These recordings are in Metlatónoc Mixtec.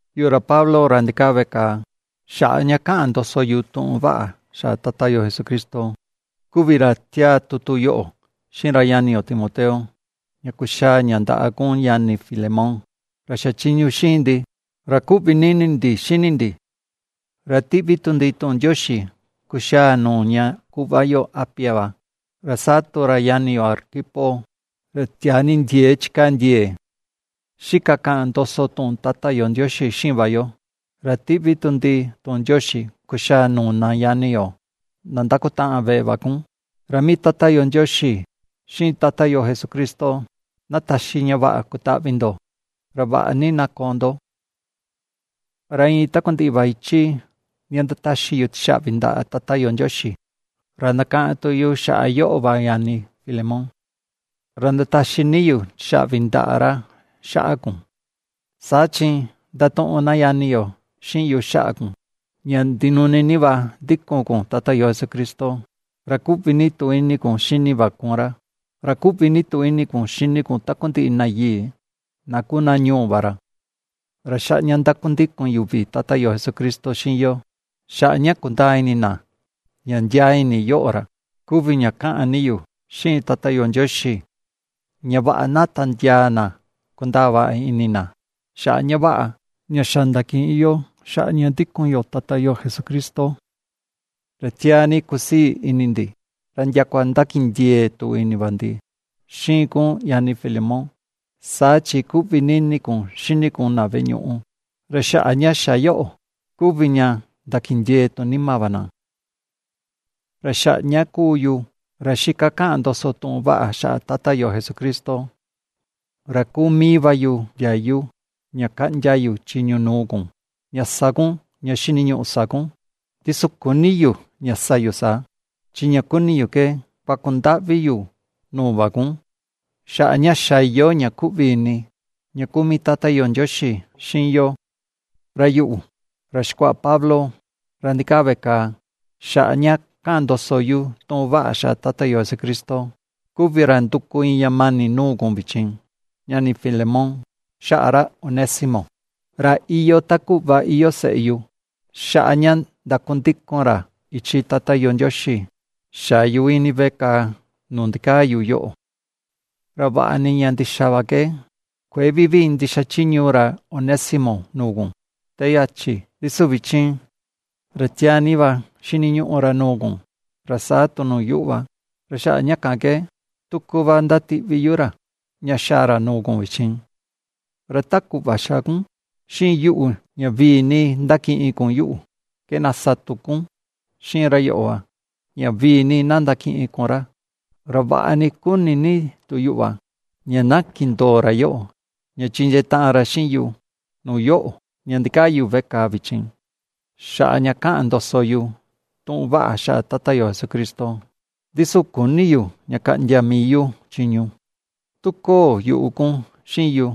Yuꞌu, ra Pablo, ra ndikaa veꞌe kàà xaꞌa ña kaꞌan ndoso yu tuꞌun vaꞌa xaꞌa Tata yo Jesucristo, kuvi ra ^tiáá tutu yoꞌo xiꞌin ra ñani yo Timoteo, ña kuxaa ña ndaꞌa kun, ñani Filemón, ra xachiñu xiꞌin ndi, ra kuꞌvi ni ini ndi xini ndi; ra ^tiꞌvi tu ndi tuꞌun ndioxi kuxaa nuu ña kuꞌva yo Apia va, ra saa tu ra ñani yo Arquipo, ra tiaa ni ndieé chikaa ndie̱e̱ xika kaꞌan ndoso tuꞌun Tata yo Ndioxi xiꞌin va yo, ra ^tiꞌvi tu ndi tuꞌun ndioxi kuxaa nuu na ñani yo na ndakutaꞌan veꞌe va kun. Ra mii Tata yo Ndioxi, xiꞌin Tata yo Jesucristo na taxi ña vaꞌa kutaꞌvi ndo, ra vaꞌa ni na koo ndo. Ra iin takundiꞌi va ichi ña ndataxi yu tixaꞌvi ndaꞌa Tata yo Ndioxi, ra ndakaꞌan tu yu xaꞌa yoꞌo va ñani Filemón, ra ndataxi ni yu tixaꞌvi ndaꞌa ra xaꞌa kun. Saa chi ^ndatuꞌun na ñani yo xiꞌin yu xaꞌa kun, ña ndinuni ni va ^ndíku̱n kun Tata yo Jesucristo, ra kuꞌvi ni tu ini kun xini va kun ra, ra ^kuꞌvi ni tu ini kun xini kun takundiꞌi na yii na kuu na ñuu va ra. Ra xaꞌa ña ndakundikun yuvi Tata yo Jesucristo xiꞌin yo, xaꞌa ña kundaa ini na ña ndiaa ini yoꞌo, ra kuvi ña kaꞌan ni yu xiꞌin Tata yo Ndioxi ña vaꞌa na tandiaa na kundaa vaꞌa ini na xaꞌa ña vaꞌa, ña xa ndakiꞌin yo xaꞌa ña ndikun yo Tata yo Jesucristo. Ra tiaa ni kusii ini ndi, ra ndiakua ndakindiee tu ini va ndi xiꞌin kun ñani Filemón, saa chi kuꞌvi ni ini kun xini kun na veꞌe ñuꞌu, ra xaꞌa ña xa yoꞌo kuvi ña ndakindiee tu nima va na. Ra xaꞌa ña kuu yu, ra xika kaꞌan ndoso tuꞌun vaꞌa xaꞌa Tata yo Jesucristo, ra kuu mii va yu ndiayu ña kaꞌndia yu chiñu nuu kun, ña sa kun ña xiniñuꞌu sa kun, ndi su küni yu ña sa yu saa, chi ña kuni yu ke kuaku ndaꞌvi yu nuu va kun, xaꞌa ña xa iyoo ña ^kuꞌvi ini ña kuu mii Tata yo Ndioxi xiꞌin yo. Ra yuꞌu, ra xikuaꞌa Pablo, ra ndikaa veꞌe kàà xaꞌa ña kaꞌan ndoso yu tuꞌun vaꞌa xaꞌa Tata yo Jesucristo, kuvi ra nduku iin ña mani nuu kun vichin, ñani Filemón, xaꞌa ra Onésimo, ra iyoo ta kuꞌva iyoo seꞌe yu, xaꞌa ña ndakundikun ra ichi Tata yo Ndioxi xa̱ yu ini veꞌe kàà nuu ndikaa yu yoꞌo. Ra vaꞌa ni ña ndixa va ke kuëe vivii ndixachiñu ra Onésimo nuu kun te yachi, ndi su vichin, ra tiaa ni va xiniñuꞌu ra nuu kun, ra saa tu nuu yuꞌu va. Ra xaꞌa ña kan ke tuku va ^ndatiꞌvi yu ra, ña xaa ra nuu kun vichin; ra ta kuꞌva ^xa kun xiꞌin yuꞌu ña vii ni ndakiꞌin kun yuꞌu, ke na sa tu kun xiꞌin ra yoꞌo va, ña vii ni na ndakiꞌin kun ra. Ra vaꞌa ni kuni ni tu yuꞌu va ña na kindoo ra yoꞌo, ña chindiee taꞌan ra xiꞌin yu nuu yoꞌo, ña ndikaa yu veꞌe kàà vichin xaꞌa ña kaꞌan ndoso yu tuꞌun vaꞌa xaꞌa Tata yo Jesucristo. Ndi su küni yu ña kaꞌndia mii yu chiñu, tu köo yuꞌu kun xiꞌin yu,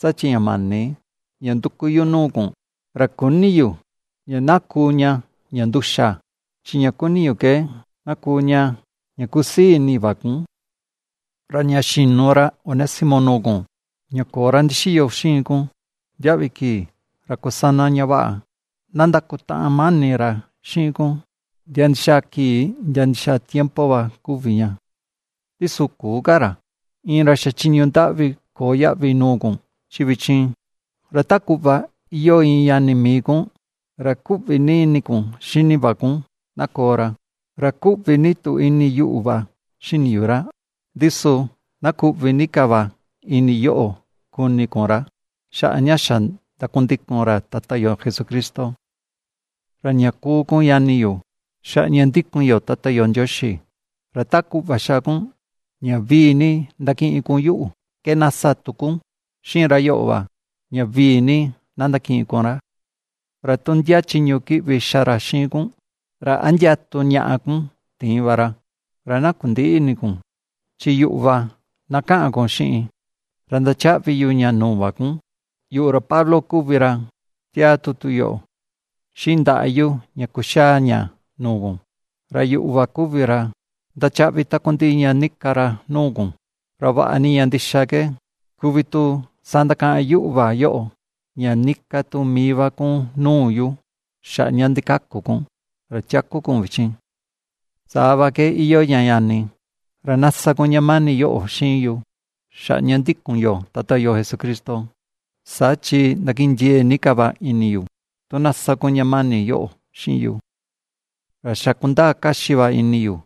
saa chi ña mani ña nduku yu nuu kun, ra küni yu ña na kuu ña ña nduxa, chi ña kuni yu ke na kuu ña ña kusii ini va kun. Ra ña xi̱nu ra Onésimo nuu kun, ña köo ra ndixiyo xiꞌin kun ndiaꞌvi kii, ra kusana ña vaꞌa na ndakutaꞌan mani ra xiꞌin kun ndia ndixaa kii ndia ndixaa tiempo va kuvi ña. Ndi su küu ka ra, iin ra xachiñu ndaꞌvi köo yaꞌvi nuu kun, chi vichin, ra ta kuꞌva iyoo iin ñani mii kun, ra ^kuꞌvi ni ini kun xini va kun na koo ra. Ra ^kuꞌvi ni tu ini yuꞌu va xini yu ra, ndi su na kuꞌvi ni ka va ini yoꞌo kuni kun ra, xaꞌa ña xa ndakundikun ra Tata yo Jesucristo. Ra ña kuu kun ñani yu, xaꞌa ña ndikun yo Tata yo Ndioxi, ra ta kuꞌva ^xa kun ña vii ni ndakiꞌin kun yuꞌu ke na sa tu kun xiꞌin ra yoꞌo va, ña vii ni na ndakiꞌin kun ra. Ra tu ndia chiñu kiꞌvi xa ra xiꞌin kun, ra a ndia tu ñaꞌa kun tiin va ra, ra na kundïꞌi ini kun, chi yuꞌu va na ka̱ꞌa̱n kun xiꞌin ra ndachaꞌvi yu ña nuu va kun. Yuꞌu, ra Pablo kuvi ra, ^tiáá tutu yoꞌo xiꞌin ndaꞌa yu ña kuxaa ña nuu kun, ra yuꞌu va kuvi ra ndachaꞌvi takundiꞌi ña nika ra nuu kun; ra vaꞌa ni ña ndixa ke kuvi tu sandakaꞌan yuꞌu va yoꞌo, ña níká tu mii va kun nuu yu xaꞌa ña ndikaku kun, ra tiaku kun vichin. Saa va ke iyoo ña ñani, ra na sa kun ña mani yóꞌo xiꞌin yu, xaꞌa ña ndikun yo Tata yo Jesucristo; saa chi ndakindiee ni ka va ini yu tu na sa kun ña mani yoꞌo xiꞌin yu. Ra xa kundaa kaxi va ini yu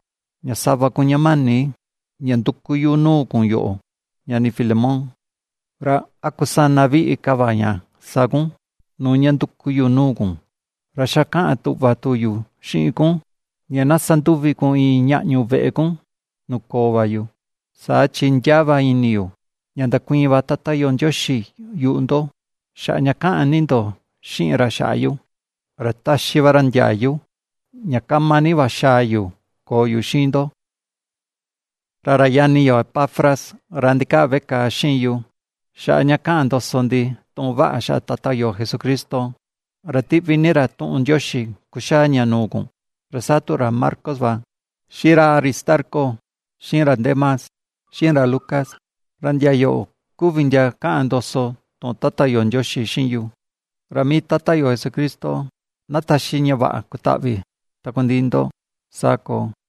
ña sa va kun ña mani ña nduku yu nuu kun yoꞌo, ñani, Filemón, ra a kusana viꞌi ka va ña sa kun nuu ña nduku yu nuu kun. Ra xa kaꞌan tuꞌva tu yu xiꞌin kun ña na sanduvi kun iin ñaꞌñu veꞌe kun nuu koo va yu, saa chi ndiaa va ini yu, ña ndakuiin va Tata yo Ndioxi yuꞌu ndo xaꞌa ña ^kaꞌan ni ndo xiꞌin ra xaꞌa yu, ra taxi va ra ndiayu ña kama ni va xaa yu koo yu xiꞌin ndo. Ra ra ñani yo, Epafras, ra ndikaa veꞌe kàà xiꞌin yu xaꞌa ña kaꞌan ndoso ndi tuꞌun vaꞌa xaꞌa Tata yo Jesucristo, ra tiꞌvi ni ra tuꞌun ndioxi kuxaa ña nuu kun, ra saa tu ra Marcos va, xiꞌin ra Aristarco, xiꞌin ra Demas, xiꞌin ra Lucas, ra ndia yoꞌo kuvi ndia kaꞌan ndoso tuꞌun Tata yo Ndioxi xiꞌin yu. Ra mii Tata yo Jesucristo na taxi ña vaꞌa kutaꞌvi takundiꞌi ndo. Saa koo.